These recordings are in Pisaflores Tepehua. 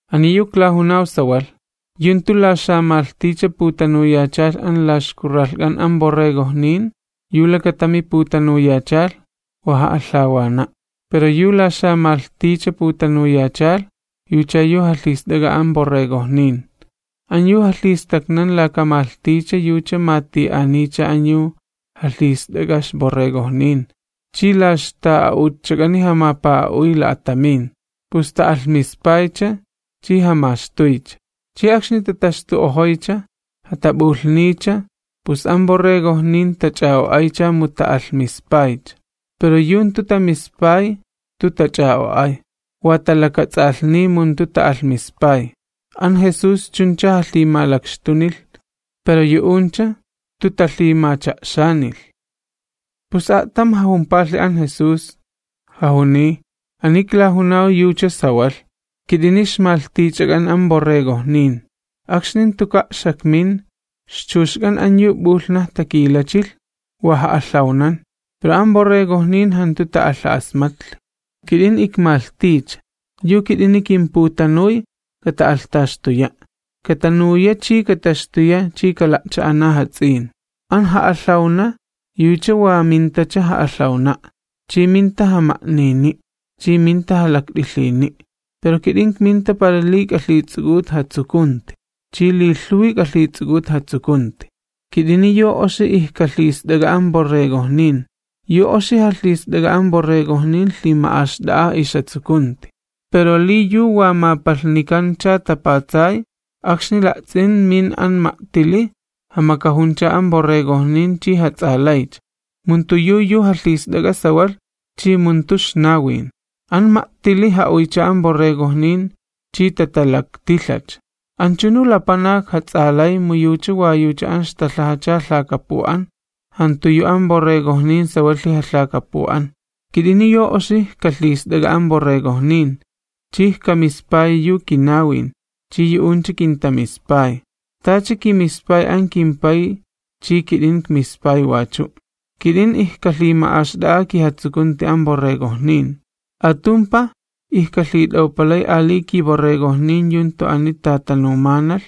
’Ani yu iklajunaw sawalh, yu jantu la xamalhticha putanuyachalh an la ixkurralhk'an an borregojnin yu lakatami putanuyachalh, wa ja'alhawna'. Pero yu la xamalhticha putanuyachalh, yucha yu jalhist'ak'a an borregojnin. An yu jalhistaknan laka malhticha yucha mati'aniycha an yu jalhist'ak'a ixborregojnin chi la ixta'a'utchak'ani jamapa'a'uy la'atamin, pus ta'alhmispaycha, chi jamaxtuycha. Chi akxni tataxtu'ojoycha, jatap'ulhniycha, pus an borregojnin tach'a'o'aycha mu ta'alhmispay. Pero yu jantu tamispay jantu tach'a'o'ay, wa talakats'alhniy mu jantu ta'alhmispay. An Jesús chuncha jalhimalakxtunilh, pero yu'uncha jantu talhimacha'xanilh. Pus a'tam jajumpalhi an Jesús, jajuniy: ―Ani iklajunaw yucha sawalh, kit'ini ixmalhtichak'an an borregojnin. Akxni jantuka' xakmin, ixchuxk'an an yu p'ulhnaj takilachilh wa ja'alhawnan, pero an borregojnin jantu ta'alha'asmatlhi. Kit'in, ikmalhticha, yu kit'ini kimputanuy kata'alhtaxtuya'. Katanuya chi kataxtuya chi kala'cha'ana jats'in. ’An ja'alhawna yucha wa mintacha ja'alhawana', chi minta jama'nini', chi minta jalakt'ilhiyni'. Pero kit'in ikminta para li k'alhits'uk'ut jatsukunti, chi li lhuwi k'alhits'uk'ut jatsukunti. Kit'ini yu oxi ijkalhist'ak'a an borregojnin. Yu oxi jalhist'ak'a an borregojnin lhima'axt'a'a ixjatsukunti. Pero li yu wa mapalhnikancha tapatsay, akxni la'ts'in min an ma'tili jamakajuncha an borregojnin chi jats'alaycha, mu jantu yu yu jalhist'ak'a sawalh chi mu jantu ixnawin. An ma'tili ja'uycha an borregojnin chi tatalaktilhacha. Anchunu lapanak jats'alay mu yucha wa yucha an ixtalhajacha lhakapu'an, jantu yu an borregojnin sawalhi jalhakapu'an. ’Kit'ini yu oxi ijkalhist'ak'a an borregojnin, chi ijkamispayi yu kinawin, chi yu'uncha kintamispay, tacha kimispay an kimPay chi kit'in ikmispay wachu'. Kit'in ijkalhima'axt'a'a kijatsukunti an borregojnin. Atumpaj ijkalhit'awpalay ali kiborregojnin yu jantu ani tatanumanalh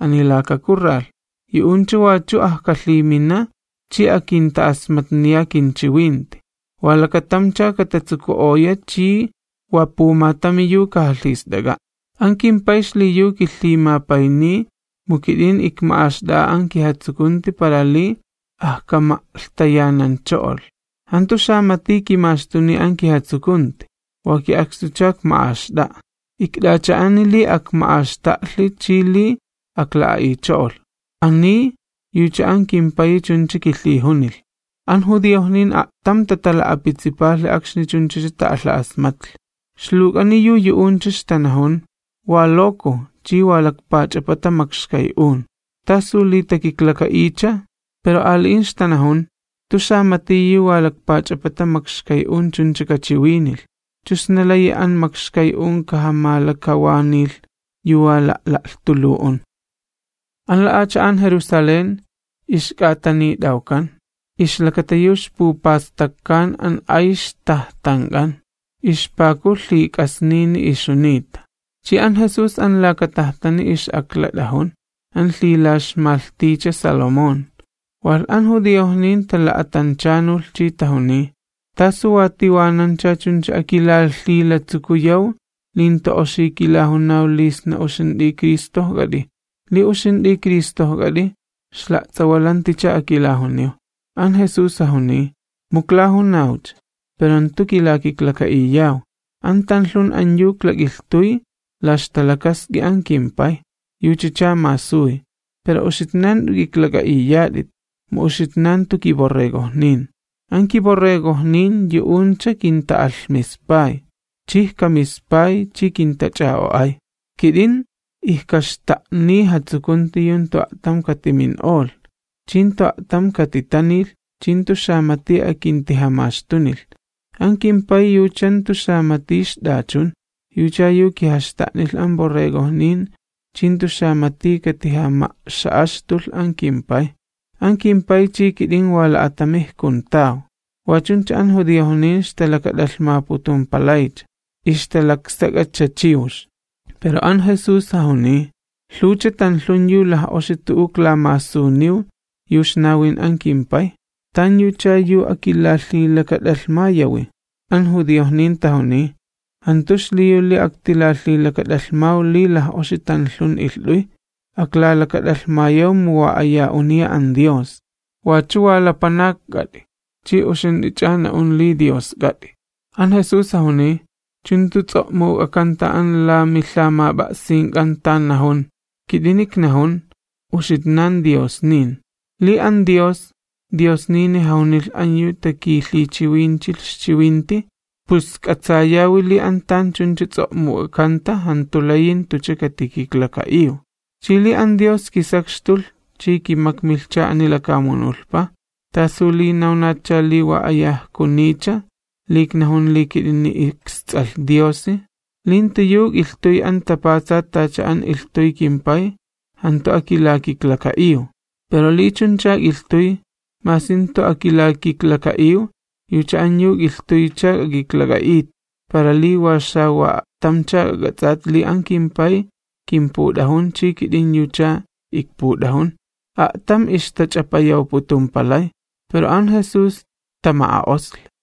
ani laka kurralh. Yu'uncha wachu ajkalhimina chi akinta'asmatniya kinchiwinti, wa lakatamcha katatsuku'oya chi wa pumatami yu kajalhist'ak'a'. ’An kimPay xliyu kilhimapayniy, mu kit'in ikma'axt'a'a an kijatsukunti para li ajkama'lhtayanancho'olh. Jantu xamati kimaxtuniy an kijatsukunti, wa ki'akstucha ikma'axt'a'a. Ikt'acha'ani li akma'axta'lhi chi li akla'a'icho'olh. Ani, yucha an kimPayi chuncha kilhijunilh. An judiojnin a'tam tatala'apitsipalhi akxni chunchacha ta'alha'asmatlhi. Ixluwk'ani yu yu'uncha ixtanajun: ―Wa loko chi wa lakpach'apata makxkay'un, ¿tasu li takiklaka'iycha? Pero ali'in ixtanajun: ―Jantu xamati yu wa lakpach'apata makxkay'un chuncha kachiwinilh. ¿Chu sna layi an makxkay'un kajamalakawanilh yu wa la'la'lhtulu'un? An la'acha'an Jerusalén ixk'atanit'awkan, ixlakata yu ixpupastakkan an ay ixtajtank'an. Ixpaku lhik'asnini ixjunita. Chi an Jesús an laka tajtani ix'aklat'ajun, an lhila'ixmalhticha Salomón. Walh an judiojnin tala'atanchanulh chi tajuniy: ―¿Tasu wa tiwanancha chuncha akilalhilatsukuyaw li jantu oxi kilajunaw li sna uxint'i Cristojk'at'i? Li uxint'i Cristojk'at'i ixla'ts'awalanticha akilajuniw. An Jesús jajuniy: ―Mu iklajunawcha, pero jantu kilakiklaka'iyaw. An tanlhun an yu iklak'ilhtuy la ixta'a'ut an kimPay, yuchacha masuy. Pero uxitnan jant'u k'iklak'a'iyat'it, mu uxitnan jantu kiborregojnin. An kiborregojnin yu'uncha kinta'alhmispay, chi ijkamispay chi kintach'a'o'ay. Kit'in ijkaxta'niy jatsukunti yu jantu a'tam katimin'olh, chi jantu a'tam katitanilh, chi jantu xamati akintijamaxtunilh. An kimPay yucha jantu xamati ixt'achun, yucha yu kijaxta'nilh an borregojnin chi jantu xamati katijama'xa'axtulh an kimPay. An kimPay chi kit'in wa la'atami ijkuntaw. Wa chuncha an judiojnin ixtalakat'alhmaputumpalaycha, ixtalaksak'acha chiwx. Pero an Jesús jajuniy: ―Lhuwcha tanlhun yu laj'oxi tu'u iklamasuniw yu ixnawin an kimPay. ¿Tanyucha yu akilalhilakat'alhmayawi? An judiojnin tajuniy: ―Jantu xliyu li aktilalhilakat'alhmaw li laj'oxi tanlhun ilht'uy, aklalakat'alhmayaw mu wa aya uniya an Dios. Wachu wa lapanakk'at'i, ch'i uxint'i na'un li Diosk'at'i. An Jesús jajuniy: ―¿Chu jantu ts'o'muk'akanta an la milhamap'a'sink'an tan najun?: “Kit'ini iknajun, uxitnan diosnin.” Li an Dios, diosnini jajunilh an yu takilhichiwinchilh ixchiwinti, pus k'atsayawi li an tan chuncha ts'o'muk'akanta jantu layi jantucha katikiklaka'iw. Chi li an Dios kisakxtulh chi kimakmilhcha ani lakamunulhpa, ¿t'asu li nawnatcha li wa aya ijkuniycha, li iknajun li kit'in isTs'alh Diosi? Li jantu yu ik'ilhtuy an tapatsat tacha an ilhtuy kimPay, jantu akilakiklaka'iw. Pero li chuncha ik'ilhtuy, masi jantu akilakiklaka'iw, yucha an yu ik'ilhtuycha k'ak'iklak'a'it, para li wa xawa'a'tamcha k'ak'ats'at li an kimPay kinput'ajun chi kit'in yucha ikput'ajun. A'tam ixtach'apayawputumpalay, pero an Jesús tama'a'osli.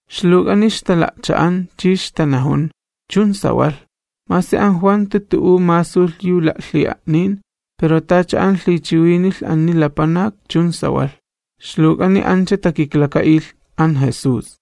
Ixluwk'ani ixtala'cha'an, chi ixtanajun: ―Chun sawalh, masi an Juan jantu tu'u masulh yu la'lhi'a'nin, pero tacha an lhichiwinilh ani lapanak chun sawalh. Ixluwk'ani ancha takiklaka'ilh an Jesús.